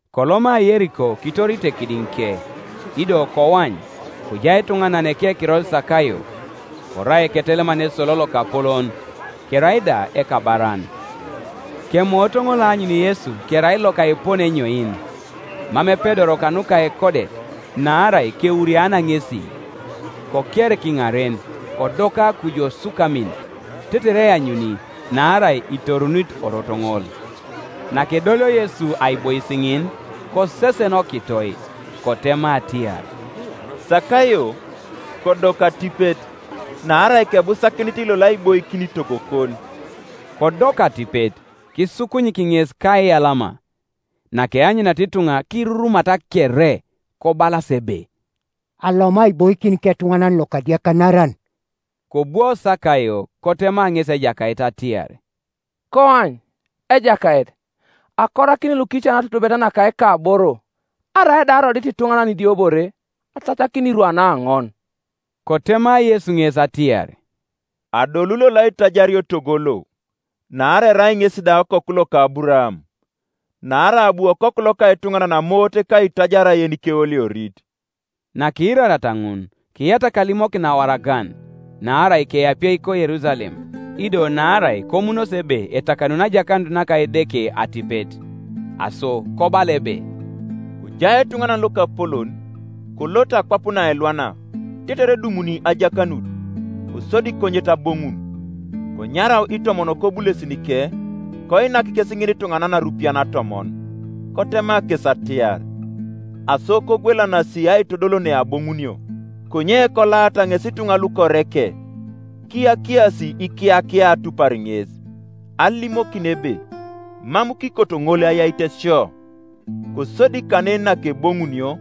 Koloma Yeriko kitorite kidiŋike, Ido koany, kojai etuŋanan ekekiror Sakayo; korai eketeleman esolo lokapolon, kerai da ekabaran, Kemoot ŋol aanyun Yesu kerai loka epone enyoin, mam epedoro kanuka ekodet, naarai kewuriana ŋesi. Koker kiŋaren, kodoka kuju osukamin, tetere eanyuni; naarai itorunit orot ŋol. Nakedolio Yesu aibois ŋin, kosesen okitoi, kotema atiar, “Sakayo, kodoku atipet; naarai kebusakinit lolo aiboikin togokon.” Kodoku atipet, kisukunyik ŋes kaiyalama. Nakeanyuniata ituŋa kirurumata kere, kobalas ebe, “Aloma aiboikin ketuŋanan lokadiakanaran.” Kobwo Sakayo, kotema ŋesi Ejakait atiar, “Koany, Ejakait, akorakini lukican atutubet naka ikaboro; arai da arodit ituŋanan idiobore, atacakini irwan aoŋon.” Kotema Yesu ŋes atiar, “Adolu lolo aitajario togo lo, naarai erai ŋesi da okoku loka Aburaam. Naarai abu Okoku loka etuŋanan amoot ka aitajar yenikeoliorit.” Nakiirariata ŋun, kiyatak alimokin awaragan, naarai keapie ko Yerusalem, ido naarai komunosi ebe etakanuni ajakanut naka Edeke atipet. Aso kobala ebe, “Kojai etuŋanan lokapolon, kolot akwap naelwana, tetere edumuni ajakanut, kosodi konyet aboŋun, Konyarau itomon kobulesinike, koinak kes ŋinituŋanan arupian atomon, kotema kes atiar, ‘Aso kogwelanasi aitodol neaboŋunio.’ Konye kolaata ŋes ituŋa lukoreke, kiyakiasi ikiyakia atupar ŋes, alimokin ebe, ‘Mam kikoto ŋol ayait sio.’ Kosodi kanen nakeboŋunio,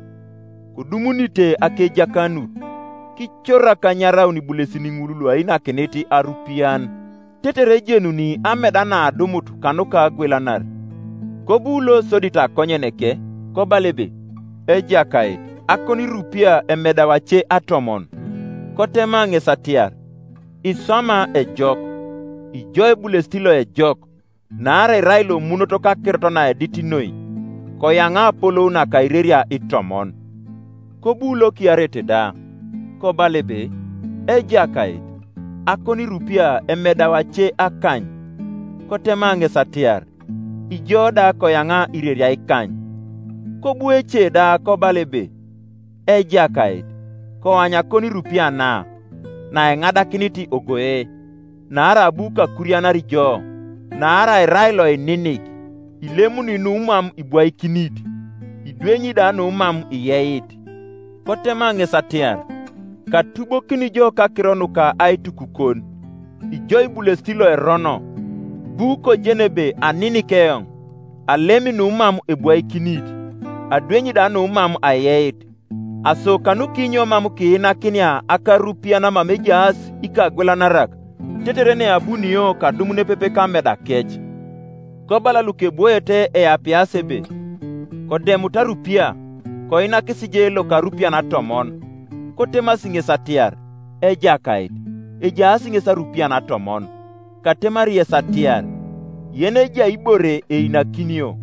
kodumunite akejakanut, kicorak anyaraun ibulesin ŋul luainakinit arupian, tetere ejenuni ameda naadumut kanuka agwelanar. Kobu losodit akonyeneke, kobala ebe, ‘Ejakait, akonirupia emedau ace atomon.’ Kotema ŋes atiar, ‘Iswama ejok, ijo ebulesit loejok! Naarai irai lomunot kakirot naedit noi, koyaŋa apolou naka ireria itomon.’ Kobu lokiareit da, kobala ebe, ‘Ejakait, akonirupia emedau ace akany.’ Kotema ŋes atiar, ‘Ijo da koyaŋa ireria ikany.’ Kobu ece da kobala ebe, ‘Ejakait, koany akonirupia na, naeŋadakinit ogoe. Naarai abu kakurianar jo, naarai irai loininik: ilemuni numam ibwaikinit, idwenyi da numam iyeit.’ Kotema ŋes atiar, ‘Katubokini jo kakiro nuka aitukukon, ijo ibulesit loerono! Ibu kojeni ebe aninik eoŋ, alemi numam ebwaikinit, adwenyi da numam ayeit. Aso kanukinyo mam kiinakinia akarupian mama ejaas ikagwelanarak, tetere neabunio kadum nepepe kamedakec?’ Kobala lukebwoete eapias ebe, ‘Kodemut arupia, koinakis je loka arupian atomon.’ Kotemasi ŋes atiar, ‘Ejakait, ejaas ŋes arupian atomon.’ ‘Katemari yes atiar, yenejai ibore einakinio;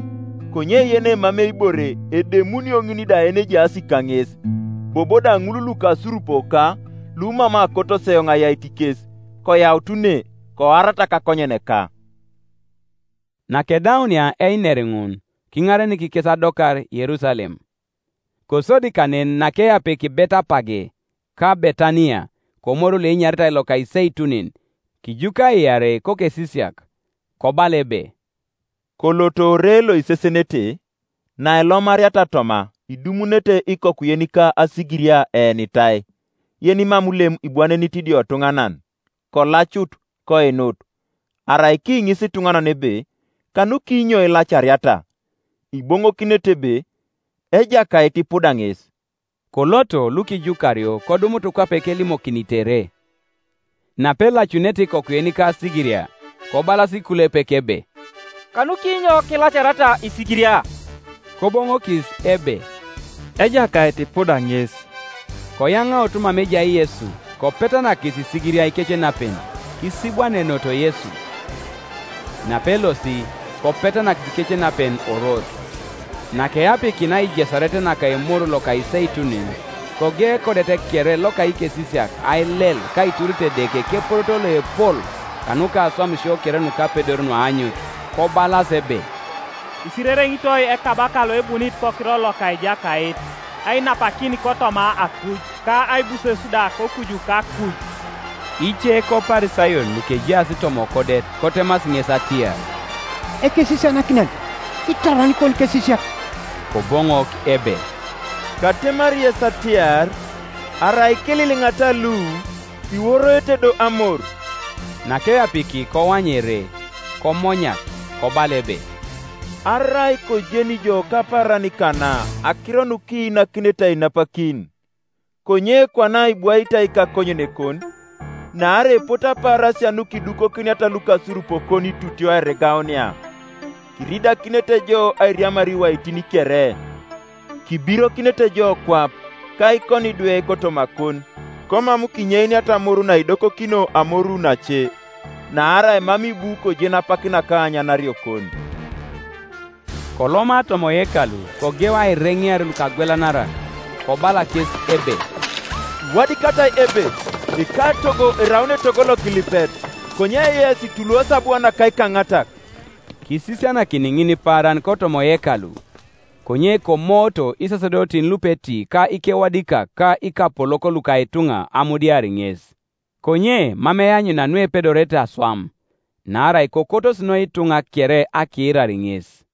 konye yenemamei ibore, edemunio ŋin da yenejaas kaŋes. Bobo da ŋul lukasurupoka, lumam akotos eoŋ ayait kes, koyaut ne, koarata kakonyeneka.’” Nakedaunia einer ŋun, kiŋarenik kes adokar Yerusalem. Kosodi kanen nakeapiki Betepage ka Betaniya, komoru loenyaritai loka Iseitunin, kijuka iarei kokesisiak, kobala ebe, “Koloto ore loisesenete; nailomariata toma idumunete ikoku yenika asigiria eenitai, yenimam lem ibwanenit idiotuŋanan: kolacut, koinut. Arai kiŋisi ituŋanan ebe, ‘Kanukinyo ilacariata?’ iboŋokinete ebe, ‘Ejakait ipuda ŋes.’” Koloto lukijukario kodumut kwape kelimokinitere. Napelacunete ikoku yenika asigiria, kobalas ikulepek ebe, “Kanukinyo ilacariata isigiria?” Koboŋokis ebe, “Ejakait ipuda ŋes.” Koyaŋaut mama ejai Yesu, kopetanakis isigiria ikecenapen, kisibwanenoto Yesu. Napelosi, kopetanakis ikecenapen orot, Nakeapikinia aijesaret naka Emoru loka Iseitunin, kogeu ekodet kere loka ikesisiak ailel ka aiturit Edeke keporoto loepol kanuka aswamisio kere nukapedor nuaanyut. Kobalas ebe, “Isirereŋitoi Ekabaka loebunit kokiror loka Ejakait! Ainapakin kotoma akuj, ka aibuses da kokuju kakuj!” Ice koParisayon lukejaas toma okodet kotemasi ŋes atiar, “Ekesisianakinan, kitoron ikonikesisiak.” Koboŋok ebe, “Katemari yes atiar, Arai kililiŋata lu, iworoete do amor.” Nakeapiki koany ere, komonyak, kobala ebe, “Arai kojeni ijo kapaaran kana akiro nukiinakinete ainapakin! Konye kwana ibwaitai kakonyenekon. Naarai epote apaarasia nukidukokiniata lukasurupokon itutio airigaunia, kiridakinete jo airiamar iwaitin kere, kibirokinete jo kwap, ka ikonidwe kotomakon, komam kinyeiniata amoru naidokokino amoru nace; naarai mam ibu kojen apak naka aanyanariokon.” Koloma toma oyekalu kogeu aireŋear lukagwelanarak. Kobala kes ebe, “Iwadikatai ebe, ‘Ekatogo eraun etogo lokilipet’; konye yes ituluosi abua naka ikaŋatak.” Kisisianakini ŋinipaaran kotoma oyekalu, Konye komooto isasedotin lupeti ka ikewadikak ka ikapolok luka ituŋa amudiar ŋes; konye mam eanyuna nuepedorete aswam, naarai kokotos noi ituŋa kere akiirar ŋes.